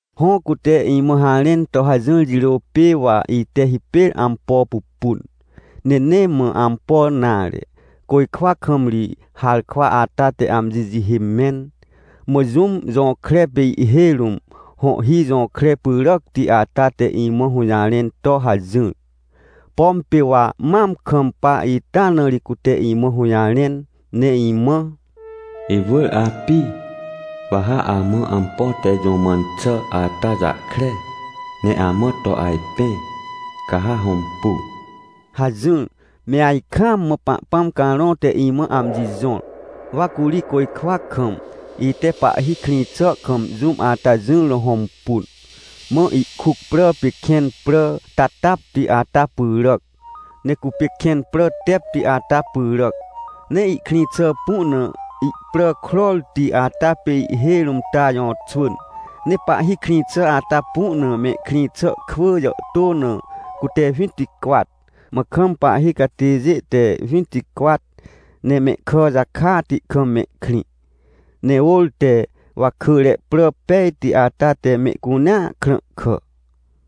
Hõ, cute imã harẽn to hajỹr jirô pê wa ite hipêr ampo pupun. Ne nee mã ampo nare, côjkwa kam ri harkwa ata te amji jihê mẽn. Mã jũm jõkre pê ihhêj rũm hõhhi jõkre pyràcti ata te imã hũjarẽn to hajỹr. Pom pê wa mam kampa ita na ri cute imã hũjarẽn ne imã: — Iwỳr api, wa ha amã ampo te jũ mãn xà ata jahkre ne amã to ajpẽ, ca ha hõmpu! — hajỹr. Me ajkaam mã Pahpãm Carõ te imã amji jõr. Wa curi côjkwa kam, ite Pahhi krĩ xà kam jũm ata jỹr na hõmpun. Mã ihkuc prà pê kẽn prà tatapti ata pyràc, ne cupê kẽn prà tepti ata pyràc. Ne ihkrĩ xà pu na ihprà krorti ata pê ihhêj rũm ta jõxwỳn. Ne Pahhi krĩ xà ata pu na mehkrĩ xà kwỳ jàhtô na cute winticwat, mã kam pahhi catêjê te winticwat, ne mehkà jakati kam mehkrĩ, ne ôr te wakỳre prà pejti ata te mehcunea krãhkà.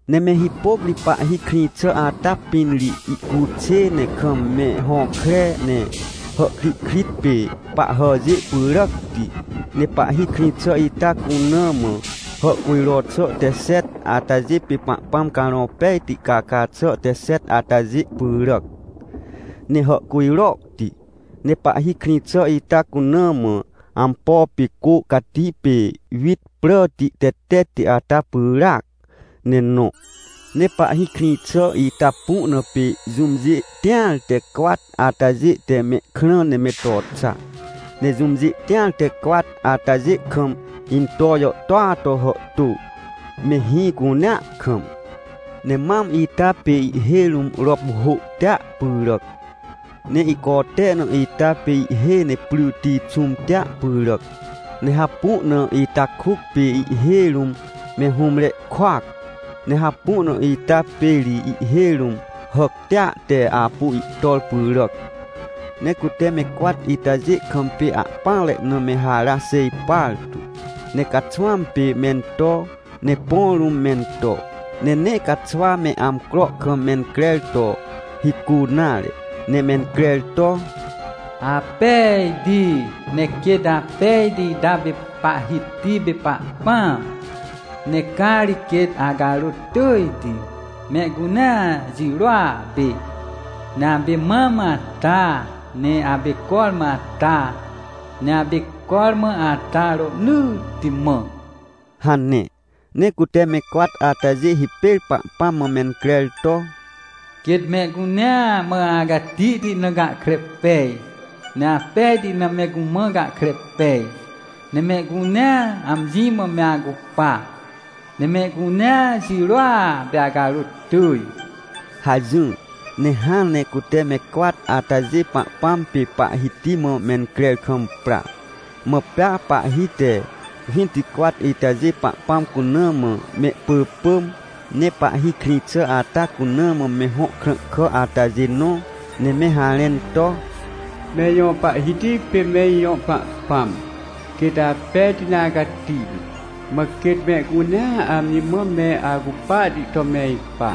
Ne me hipôc ri Pahhi krĩ xà ata pĩn ri ihcuxê, ne kam me hõkre, ne hàhkrihkrit pê pahhàjê pyràcti. Ne Pahhi krĩ xà ita cuna mã hàhcujro xà te xet, atajê pê Pahpãm Carõ Pejti caca xà te xet atajê pyràc, ne hàhcujrohti. Ne Pahhi krĩ xà ita cuna mã ampo pê cô cati pê wit pràti tetetti ata pyràac ne nõ. Ne Pahhi krĩ xà ita pu na pê jũmjê tĩar te cwat atajê te mehkrã ne me to xa. Ne jũmjê tĩar te cwat atajê kam into jàhtôa to hàhtô, me hĩ cunea kam. Ne mam ita pê ihhêj rũm rop hôhtia pyràc. Ne ihcote na ita pê ihhêj ne pryti xũmtia pyràc. Ne hapu na ita kuc pê ihhêj rũm me hũmre kuac. Ne hapu na ita pê ri ihhêj rũm hàctia te apu ihtor pyràc. Ne cute me cwat itajê kam pê ahpỹanre na me hara xêj partu. Ne caxwãm pê mento, ne põ rũm mento. Ne nee caxwa me amcro kam mencrer to hicu nare, ne mencrer to: “Apejti! Ne quêt apejti ita pê Pahhiti pê Pahpãm! Ne ca ri quêt acarôt tỳjti, mehcunea jirôa pê. Ne apê mam ata, ne apê cormã ata, ne apê cormã ata rohnỳtti mã” hane. Ne cute me cwat atajê hipêr Pahpãm mã mencrer to: “Quêt mehcunea mã acatihti na gahkre pej, ne apejti na me cumã gahkre pej. Ne mehcunea amji mã me acupa. Ne mehcunea jirôa pê acarôt tỳj!” hajỹr. Ne hãn ne cute me cwat atajê Pahpãm pê Pahhiti mã mencrer kam pra, mã pea pahhi te winticwat itajê Pahpãm cuna mã mehpỳpỳm, ne Pahhi krĩ xà ata cuna mã me hõ krãhkà atajê nõ, ne me harẽn to: “Me ijõ Pahhiti pê me ijõ Pahpãm, quêt apejti ne acatihti, mã quêt mehcunea amji mã me acupahti to me ipa.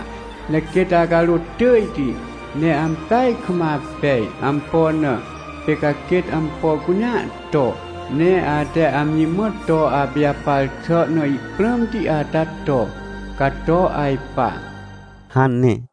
Ne quêt acarôt tỳjti, ne ampeaj kam apej. Ampo na? Pê ca quêt ampo cunea to. Ne ate amji mã to apijapar xà na ihprãmti ata to, ca to ajpa” hane.